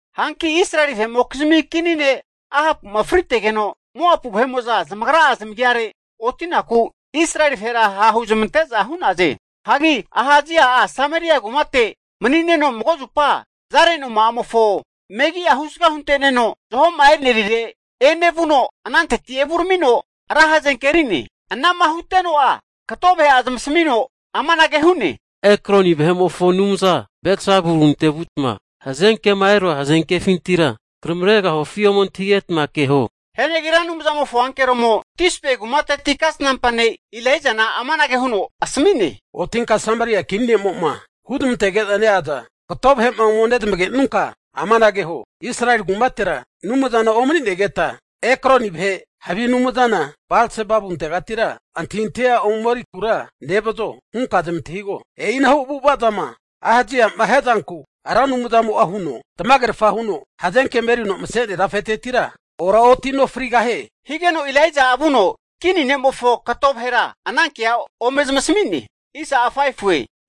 Hanki Israeli vahe'mokizmi kini ne' Ahapu'ma fritegeno, Moapu vahe'mo'za zamagra'a zamagiare oti'naku, Israeli vahera ha'huzamante'za hu'naze. Hagi Ahasia'a Sameria kumate mani'neno mago zupa zare noma'amofo megi'a husga hunte'neno zaho'ma enerire enevuno, ananteti evuramino ra hazenke eri'ne. Anama huteno'a kato vahe'a zamasmino amanage hu'ne, Ekroni vahe'mofo anumza Balsebabunte vutma hazenkema erua hazenkefintira kanamregahufi ome antahigetma keho. Hianagi Ra Anumzamofo ankeromo Tisbe kumateti kasnampa ne' Elaijana amanage huno asmi'ne, Otinka Sameria kini ne'mo'ma huzmantege'za neaza kato vahe'ma ome nezamagenunka amanage huo, Israeli kumatera Anumzana omani'negeta Ekroni vahe havi anumzana Balsebabuntegatira antahintahia ome erikura nevazo hunka zamantahigo? E'inahu avu'avazama Ahaziama hiazanku Ra Anumzamo'a huno tamagerfa huno hazenkema erino mase'nea tafetetira oraotino frigahie! Higeno Elaija'a vuno kini ne'mofo kato vahera, anankea ome zamasami'ne.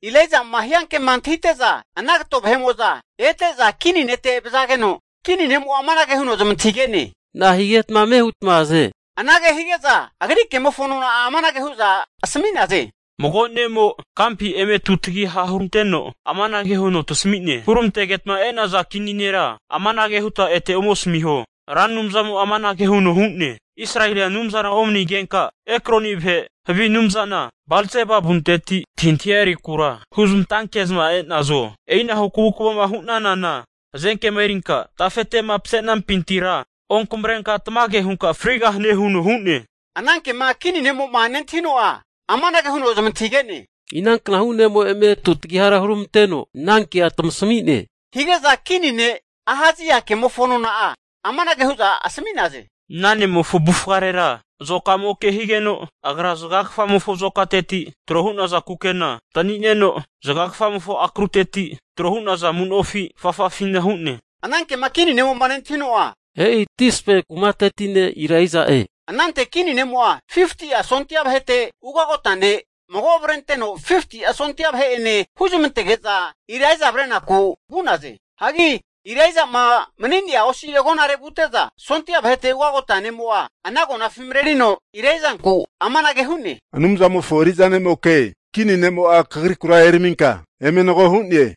Elaijama hiankema antahite'za ana kato vahe'mo'za ete'za kini nete vazageno, kini ne'mo amanage huno zamantahige'ne, na'ahigetma ame hutma aze? Anage hige'za agri kemofo nona'a amanage hu'za asmi'naze, Mago ne'mo kampi eme tutagiha huranteno amanage huno tasami'ne, huramantegeta e'naza kini nera amanage huta ete ome asamiho, Ra Anumzamo'a amanage huno hu'ne, Israelia Anumzana omani'negenka Ekroni vahe havi anumzana Balzebabunteti antahintahia erikura huzmantanke'zma e'nazo? E'inahu kavukvama hu'nanana, hazenkema erinka tafete'ma mase'nampintira onkanamrenka tamage hunka frigahane huno hu'ne. Anankema kini ne'mo'ma nentahino'a amanage huno zamantahige'ne, inanknahu ne'mo eme tutagihara huramanteno anankea tamasami'ne? Hige'za kini ne' Ahazia ke'mofo nona'a amanage hu'za asami'naze, Ana ne'mofo avufarera azokamoke higeno, agra zagagafamofo azokateti tro hu'naza kukena antani'neno, zagagafamofo akruteti tro hu'naza amu'nofi afafafina hu'ne. Anankema kini ne'mo'ma nentahino'a, e'i Tisbe kumateti ne' Elaija'e. Anante kini ne'mo'a 50'a sondia vahete ugote'nea ne' mago avrenteno 50'a sondia vahe'ene huzamantege'za Elaija avrenaku vu'naze. Hagi Elaija'ma mani'nea osi agonare vute'za, sondia vahete ugote'nea ne'mo'a ana agonafi marerino Elaijanku amanage hu'ne, Anumzamofo eri'za ne'moke, kini ne'mo'a kagrikura eraminka eme nago hu'ne.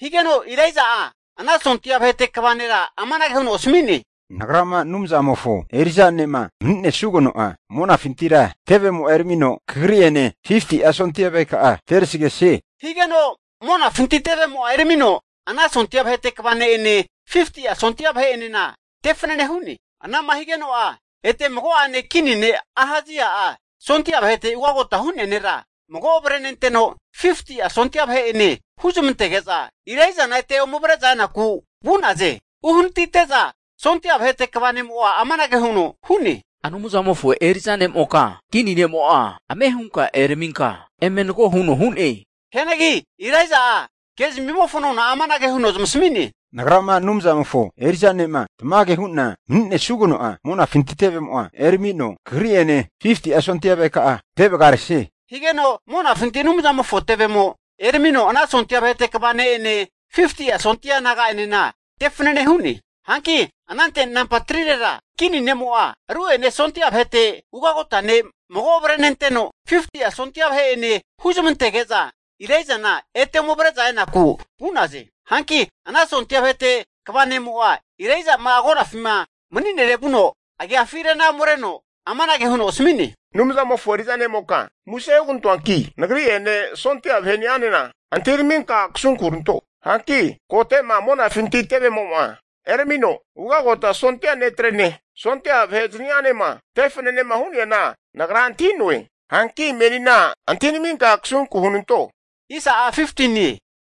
Higeno Elaija'a ana sondia vahete kva nera amanage huno asmi'ne, Nagrama Anumzamofo eri'za ne'ma mani'nesugeno'a, monafintira tevemo'a eramino kagri'ene 50'a sondia vaheka'a terasgesie. Higeno monafinti tevemo'a eramino ana sondia vahete kva ne'ene, 50'a sondia vahe'enena te fanane hu'ne. Anama higeno'a ete mago'ene kini ne' Ahazia'a sondia vahete ugagota hu'nea nera mago avrenteno 50'a sondia vahe'ene huzamantege'za Elaijana ete ome avre'za enaku vu'naze. Hagi anante uhanatite'za sondia vahete kva ne'mo'a amanage huno hu'ne, Anumzamofo eri'za ne'moka, kini ne'mo'a ame hunka eraminka eme nago huno hu'ne! Hianagi Elaija'a kezmimofo nona'a amanage huno zamasami'ne, Nagrama Anumzamofo eri'za ne'ma tamage hu'na mani'nesugeno'a, monafinti tevemo'a eramino, kagri'ene 50'a sondia vaheka'a te vagaresie. Higeno monafinti Anumzamofo tevemo eramino ana sondia vahete kva ne'ene 50'a sondia naga'anena te fanane hu'ne. Hanki anante nampa 3rera kini ne'mo'a ru'ene sondia vahete ugagote'nea ne' mago avrenenteno, 50'a sondia vahe'ene huzamantege'za Elaijana ete ome avre'za enaku vu'naze. Hanki ana sondia vahete kva ne'mo'a Elaija'ma agonafima mani'nere vuno agiafi rena omereno amanage huno asmi'ne, Anumzamofo eri'za ne'moka muse hugantoanki, nagri'ene sondia vahe'ni'anena, antahiraminka kasunku huranto. Hanki kote'ma monafinti tevemo'ma eramino, ugagota sondia netrene, sondia vahe zani'anema te fanenema hu'neana nagra antahi'noe. Hanki menina antahinaminka kasunku hunanto.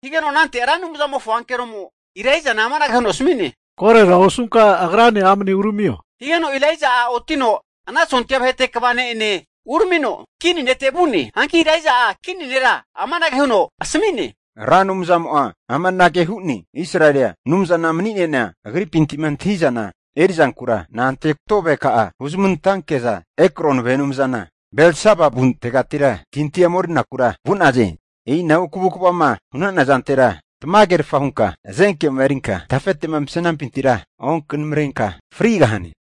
Higeno anante Ra Anumzamofo ankeromo Elaijana amanage huno asmi'ne, Korora osunka agrane amne uramio. Higeno Elaija'a otino ana sondia vahete kva ne'ene uramino, kini nete vu'ne. Hanki Elaija'a kini nera amanage huno asmi'ne, Ra Anumzamo'a amanage hu'ne, Israelia Anumzama mani'neana Agripintima antahi'zana eri'zankura na'ante kato vaheka'a huzmantanke'za Ekroni vahe anumzana Balsebabuntegatira antahintahia ome erikura vu'naze. E'inahu kavukvama hu'nana zantera tamagerfa hunka hazenkema erinkama tafete'ma mase'nampintira onkanamrenka frigahane.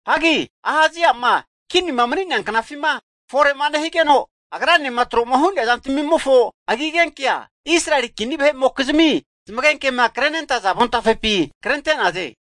Hanki Ahazia'ma kinima mani'nea knafima fore'ma nehigeno, agranema tro'ma hu'nea zantamimofo agigenkea, Israeli kini vahe'mokizmi zamagenkema krenentaza avontafepi krente'naze.